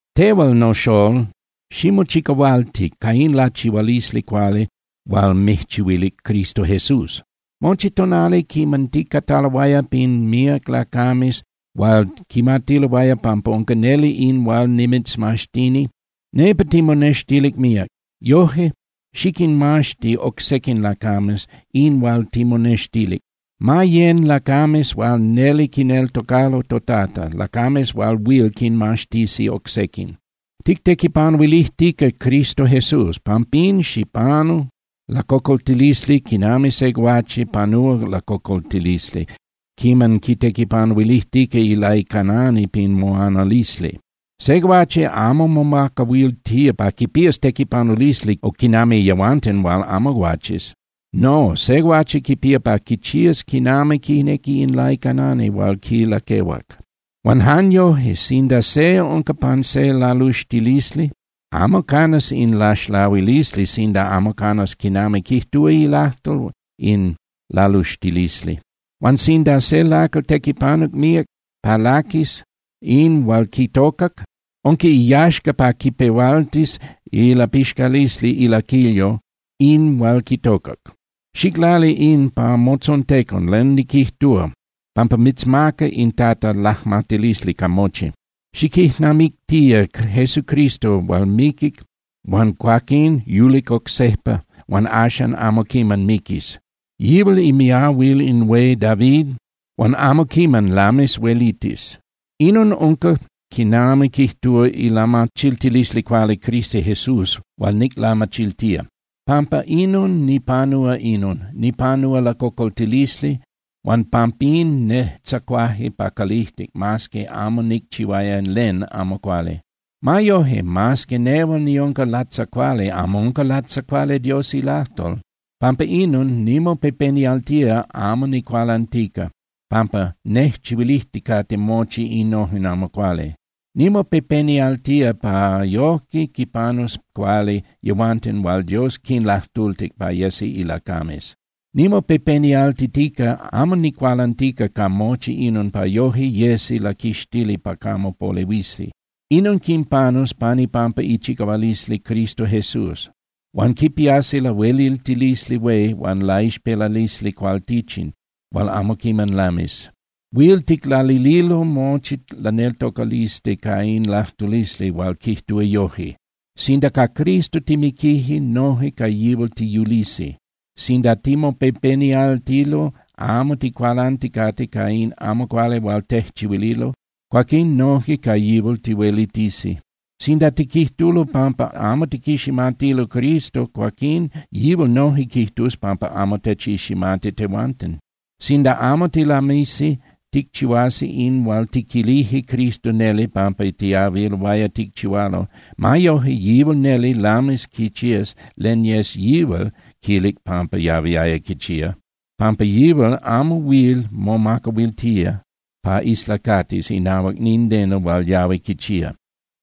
Tehual, noxolol, ximochicahualti ca in lachihualisli cuali hual mijchihuilic Cristo Jesús. Mochi tonali quiman ticataloaya pin míac lacames hual quimatiloaya pampa unca neli in hual nimitzmaxtini, nepa timonextilic míac. Yoje, xiquinmaxti oc sequin lacames in hual timonextilic. Ma yén (yecan) lacames hual neli quineltocalo toTata, lacames hual huil quinmaxtisi oc sequin. Tictequipanuilijtica Cristo Jesús. Pampín, xipanu lacocoltilisli quinami se guache panúa lacocoltilisli quiman quitequipanuilijtica ilaicanani pin moanalisli. Se guache amo momacahuiltía pa quipías tequipanulisli quinami yehuanten hual amo guaches. No, se guache quipía pa quichías quinami quinequi in laicanani hual quilaquehuac. Huan jan yoje, sinda se unca pan se laluxtilisli, amo canas in laxlahuilisli sinda amo canas quinami quijtúa ilajtol in laluxtilisli. Huan sinda se lacal tequipanuc míac pa laquis in hual quitocac, unca iyaxca pa quipehualtis ilapixcalisli ilaquilyo in hual quitocac. Xiclali in pa motzontecon len niquijtúa, pampa mitzmaca in Tata lajmatilisli ca mochi. Xiquijnamictía Jesucristo hual miquic huan cuaquín yulic oc sejpa huan axan amo quiman miquis. Yihual imiahuil in hué David huan amo quiman lamis huelitis. Inon unca quinami quijtúa ilamachiltilisli cuali Cristo Jesús hual niclamachiltía. Pampa inon nipanúa inon, nipanúa lacocoltilisli huan pampín nejtzacuaje pa calijtic mas que amo nicchihuaya len amo cuali. Ma yoje, mas que nehual niunca latzacuali, amo unca latzacuali Dios ilajtol. Pampa inon nimopepenialtía amo nicualantica pampa nejchihuilijticate mochi innojen amo cuali. Nimopepenialtía pa yojque quinpanus cuali yehuanten hual Dios quinlajtultic pa yesi ilacames. Nimopepenialtitica amo nicualantica ca mochi inon pa yoje yesi laquixtili pa camo polehuisi. Inon quinpanus pan ipampa ichicahualisli Cristo Jesús, huan quipiasi lahueliltilisli hué huan laixpelalisli cualtichin hual amo quiman lamis. Huil ticlalililo mochi laneltocalisli ca in lajtulisli hual quijtúa yoje: Sinda ca Cristo timiquije, noje ca yihual tiyulisi. Sinda timopepenialtilo amo ticualanticate ca in amo cuali hual tejchihuililo, cuaquín noje ca yihual tihuelitisi. Sinda tiquijtulo pampa amo tiquiximatilo Cristo, cuaquín yihual noje quijtus pampa amo techiximati tehuanten. Sinda amo tilamisi ticchihuasi in hual tiquilije Cristo neli pampa tiyahuiloaya ticchihualo, ma yojque yihual neli lamis quichías len yes yihual quilic pampa yahuiaya quichía, pampa yihual amo huil momacahuiltía pa islacatis inahuac nindeno hual yahui quichía.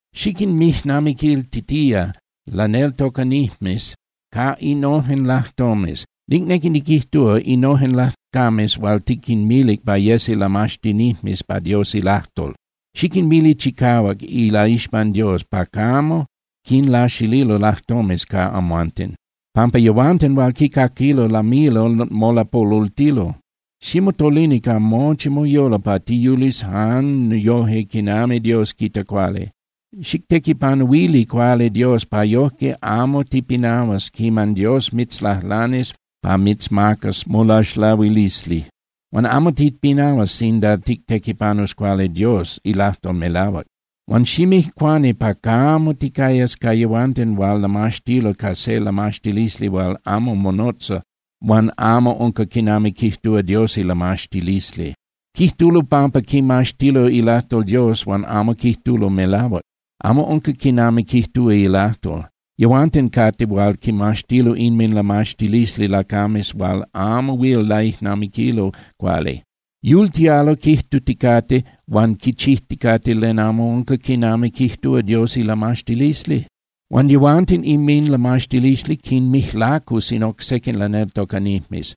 Xiquinmijnamiquiltitía laneltocanijmes ca innojen lajtomes, nicnequi niquijtúa, innojen lacames hual tiquinmilic pa yesi lamaxtinijmes pa Dios ilajtol. Xiquinmili chicahuac ilaixpan Dios pa camo quinlaxililo lajtomes ca amhuanten, pampa yehuanten hual quicaquilo lamilo molapolultilo. Ximotolini ca mochi moyolo pa tiyulis jan yoje quinami Dios quita cuali. Xictequipanuili cuali Dios pa yojque amo tipinahuas quiman Dios mitzlajlanis pa mitzmacas molaxlahuilisli. Huan amo tipinahuas sinda tictequipanus cuali Dios ilajtol melahuac. Huan ximijcuani pa camo ticayas ca yehuanten hual lamaxtilo ca se lamaxtilisli hual amo monotza huan amo unca quinami quijtúa Dios ilamaxtilisli. Quijtulo pampa quimaxtilo ilajtol Dios huan amo quijtulo melahuac, amo unca quinami quijtúa ilajtol. Yehuanten cate hual quimaxtilo inminlamaxtilisli lacames hual amo huil laijnamiquilo cuali. Yultialo quijtuticate huan quichijticate len amo unca quinami quijtúa Dios ilamaxtilisli. Huan yehuanten inminlamaxtilisli quinmijlacus in oc sequin laneltocanijmes,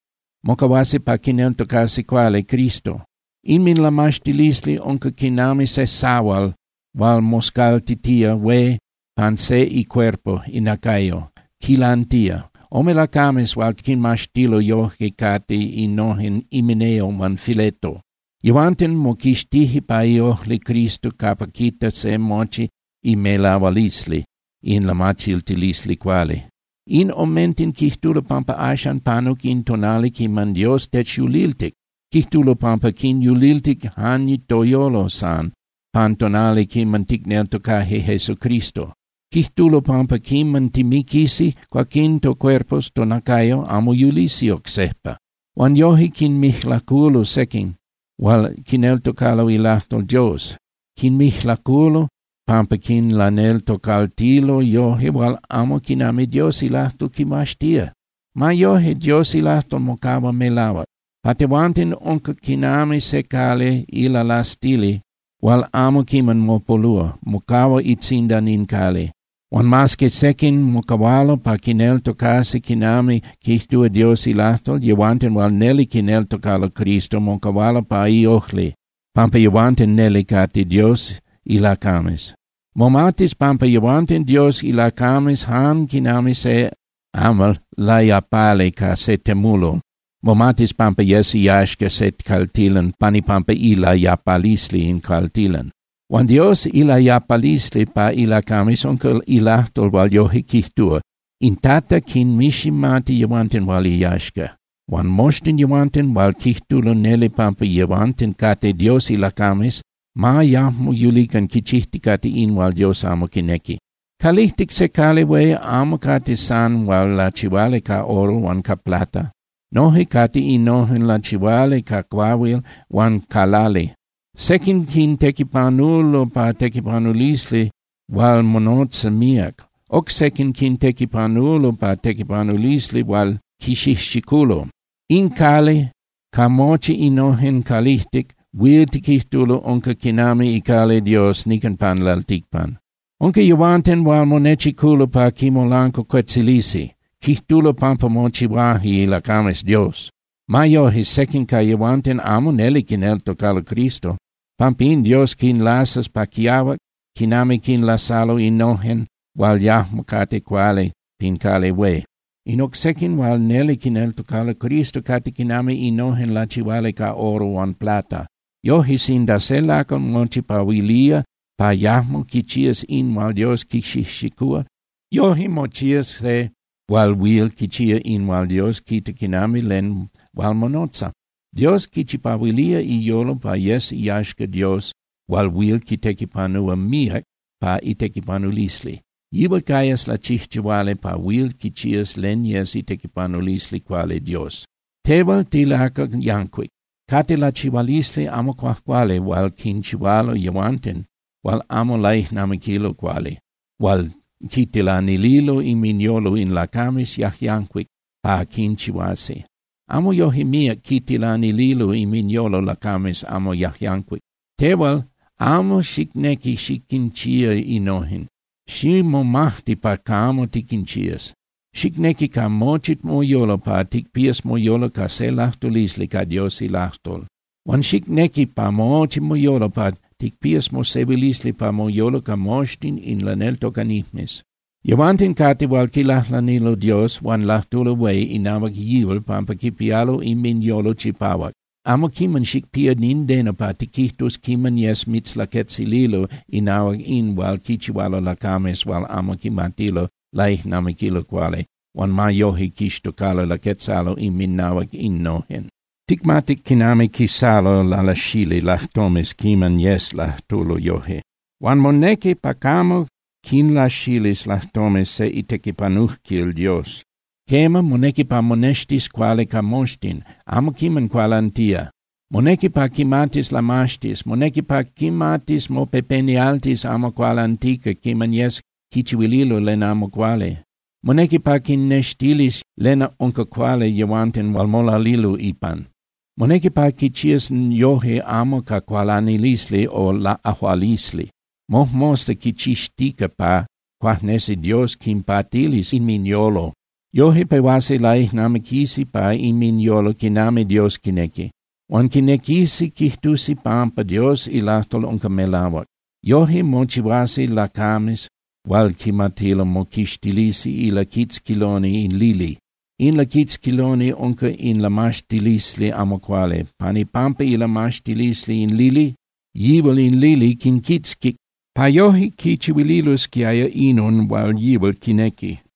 mocahuasi pa quineltocasi cuali Cristo. Inminlamaxtilisli unca quinami se sahual hual moscaltitía hué pan se icuerpo (inacayo), quilantía. Ome lacames hual quinmaxtilo yoje cate innojen Himeneo huan Fileto. Yehuanten moquixtije pa iojli Cristo capa quita se mochi imelahualisli in lamachiltilisli cuali. In omenten quijtulo pampa axan panuc in tonali quiman Dios techyuliltic, quijtulo pampa quinyuliltic jan toyolo san pan tonali quiman ticneltocaje Jesucristo. Quijtulo pampa quiman timiquisi, cuaquín tocuerpos (tonacayo) amo yulisi oc sejpa. Huan yoje quinmijlaculo sequin hual quineltocalo ilajtol Dios. Quinmijlaculo pampa quinlaneltocaltilo yoje hual amo quinami Dios ilajtol quimaxtía. Ma yojque, Dios ilajtol mocahua melahuac. Pa tehuanten unca quinami se cali ilalastili hual amo quiman mopolúa, mocahua itzindan in cali. Huan mas que sequin mocahualo pa quineltocasi quinami quijtúa Dios ilajtol, yehuanten hual neli quineltocalo Cristo mocahualo pa iojli, pampa yehuanten neli cate Dios ilacames. Momatis pampa yehuanten Dios ilacames jan quinami se amal layapali ca se temulol momatis pampa yes iyaxca se caltilan pan ipampa ilayapalisli in caltilan. Huan Dios ilayapalisli pa ilacames unca ilajtol hual yoje quijtúa: “In Tata quinmiximati yehuanten hual iyaxca”, huan “Moxtin yehuanten hual quijtulo neli pampa yehuanten cate Dios ilacames, ma yajmo yulican quichijticate in hual Dios amo quinequi.” Calijtic se cali hué amo cate san hual lachihuali ca oro huan ca plata. Noje cate innojen lachihuali ca cuahuil huan ca lali. Sequin quintequipanulo pa tequipanulisli hual monotza míac. Oc sequin quintequipanulo pa tequipanulisli hual quixijxiculo. In cali ca mochi innojen calijtic huil tiquijtulo unca quinami icali Dios nican pan lalticpan. Unca yehuanten hual monechiculo pa quimolancuacuetzilisi, quijtulo pampa mochihuaje ilacames Dios. Ma yoje, sequin ca yehuanten amo neli quineltocalo Cristo. Pampín Dios quinlasas pa quiahuac quinami quinlasalo innojen hual yajmo cate cuali pin cali hué. In oc sequin hual neli quineltocalo Cristo cate quinami innojen lachihuali ca oro huan plata. Yoje, sinda se lacal mochipahuilía pa yajmo quichías in hual Dios quixijxicúa, yoje mochías se hual huil quichía in hual Dios quita quinami len hual monotza. Dios quichipahuilía iyolo pa yes iyaxca Dios hual huil quitequipanúa míac pa itequipanulisli. Yihual cayas lachijchihuali pa huil quichías len yes itequipanulisli cuali Dios. Tehual tilacal yancuic. Cate lachihualisli amo cuajcuali hual quinchihualo yehuanten hual amo laijnamiquilo cuali hual quitilanililo inminyolo in lacames yajyancuic pa quinchihuasi. Amo yoje míac quitilanililo inminyolo lacames amo yajyancuic. Tehual amo xicnequi xiquinchía innojen, ximomajti pa camo tiquinchías. Xicnequi ca mochi moyolo pa ticpías moyolo ca se lajtulisli ca Dios ilajtol. Huan xicnequi ca mochi moyolo pa ticpías mosehuilisli pa moyolo ca moxtin in laneltocanijmes. Yehuanten cate hual quilajlanilo Dios huan lajtulo hué inahuac yihual pampa quipialo inminyolo chipahuac. Amo quiman xicpía nindeno pa tiquijtus quiman yes mitzlaquetzililo inahuac in hual quichihualo lacames hual amo quimatilo laijnamiquilo cuali huan ma yoje quixtocalo laquetzalo inminahuac innojen. Ticmatic quinami quisalo lalasali lajtomes quiman yes lajtulo yoje. Huan monequi pa camo quilaxilis lajtomes se itequipanujquil Dios. Quema, monequi pa monextis cuali ca moxtin, amo quiman cualantía. Monequi pa quimatis lamaxtis, monequi pa quimatis mopepenialtis amo cualantica quiman yes quichihuililo len amo cuali. Monequi pa quinnextilis len unca cuali yehuanten hual molalilo ipan. Monequi pa quichías yoje amo ca cualanilisli o laꞌajualisli, mojmosta quichixtica pa cuajnesi Dios quinpatilis inminyolo. Yoje pehuasi laijnamiquisi pa inminyolo quinami Dios quinequi. Huan quinequisi quijtusi pampa Dios ilajtol unca melahuac. Yoje mochihuasi lacames hual quimatilo moquixtilisi ilaquitzquiloni in lili. In laquitzquiloni unca in lamaxtilisli amo cuali. Pan ipampa ilamaxtilisli in lili, yihual in lili quinquitzquic pa yoje quichihuililosquiaya inon hual yihual quinequi.